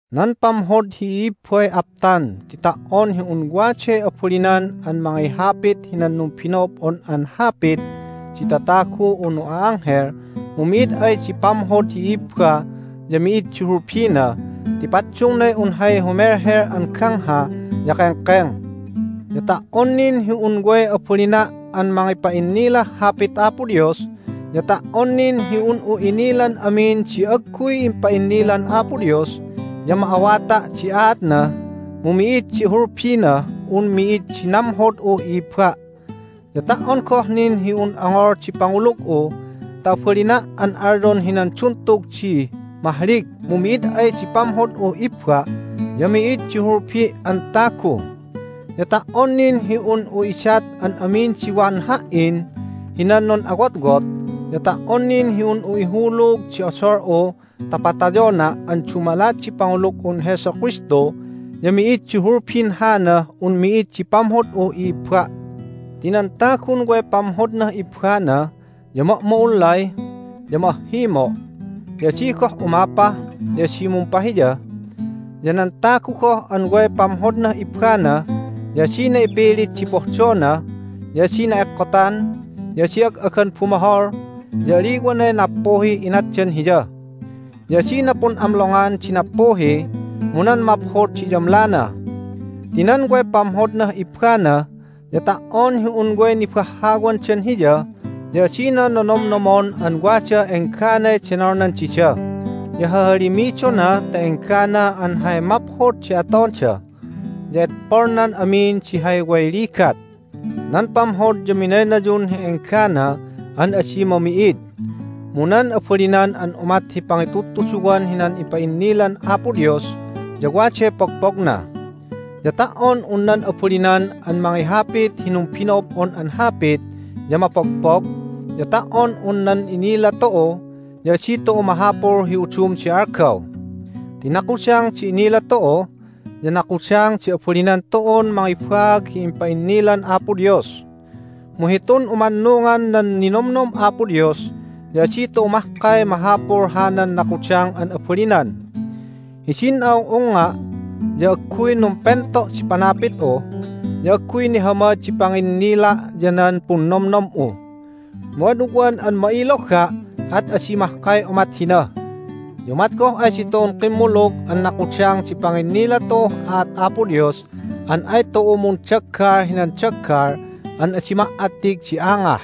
Nan pamhod hi i'ibbay aptan ti ta"on hi un waday abalinan an mangihapit hinan numbino'ob'on an hapit di tatagu unu a'anghel mu mi'id ay di pamhod hi i'ibba ya mi'id di hulbina ti paddungnay un hay humelhel an gangha ya kengkeng. Ya ta"on nin hi un way abalina' an mangipa'innilah Hapit Apo Dios, ya ta"on nin hi un'u inilan amin di agguy impa'innilan Apo Dios ya ma'awata' di aatna, mu mi'id di hulbinah un mi'id di namhod'uh i'ibba'. Ya ta"on goh nin hi un ongol di pangulug'u ta abalina' an alyon hinan duntug di mahlig mu mi'id ay di pamhod'uh ibba' ya mi'id di hulbi' an tagu. Ya ta"on nin hi un'u idat an amin di wan ha"in hinan nun'awotwot, ya ta"on nin hi un'u ihulug di odol'u ta patayona' an dumalat di pangulug'un Jesu Kristu ya mi'id di hulbin hanah un mi'id di pamhod'uh i'ibba'. Ti nan tagun way pamhodnah ibbana ya ma'ma'ullay, ya ma'ahhimo'. Ya adi goh umapa, ya adi mumpahiya. Ya nan tagu goh an way pamhodnah ibbana ya adina ipilit di pohdona, ya adi na'ekkotan, ya adi ag'agan bumohol, ya aliwanay nappuhih inatdan hiya. Ya adina pun'amlongan di nappuhi, mu nan maphod di iyamlana. Ti nan way pamhodnah ibbana ya ta"on hi un way nibahhawandan hiya ya adina nonomnomon an wadah engganay denolnan dida, ya hahalimidona ta enggana an hay maphod di atonda, ya edpolnan amin di hay way ligat. Nan pamhod ya minaynayun hi enggana an adi mami'id. Mu nan abalinan an umat hi pangitudtuduwan hinan ipa'innilan Apo Dios ya waday pogpogna. Ya ta"on un nan abalinan an mangihapit hi numbino'ob'on an hapit ya mapogpog, ya ta"on un nan inila tu'u ya adi tu'u mahapul hi udum di algaw. Ti nakudang di inila tu'u, ya nakudang di abalinan tu'un mangibaag hi impa'innilan Apo Dios. Mu hitun umannungan nan ninomnom Apo Dios ya adi tu'u mahkay mahapul hanan nakudang an abalinan. Hidin a'ung'ungnga' ya agguy numpento' di panapit'u, ya agguy nihamad di panginnila' ya nan punnomnom'u. Mu ad ugwan an ma'iloga', at adi mahkay umat hina. Ya umat goh ay ditu'un kimmulug an nakudang di panginnila tu'uh aat Apo Dios an ay tu'u mundaggal hinan daggal an adi ma"attig di angah.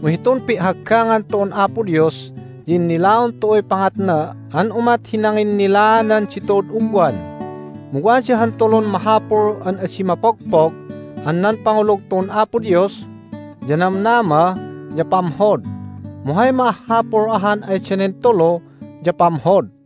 Mu hitun pi'haggangan tu'un Apo Dios ya innilaon tu'uy pangatna an umat hi nanginnilaanan ditu'ud ugwan. Mu wada han tulun mahapul an adi mapogpog an nan pangulug tu'un Apo Dios, ya namnama, ya pamhod. Mu hay ma'ahhapul ahan ay danen tulu ya pamhod.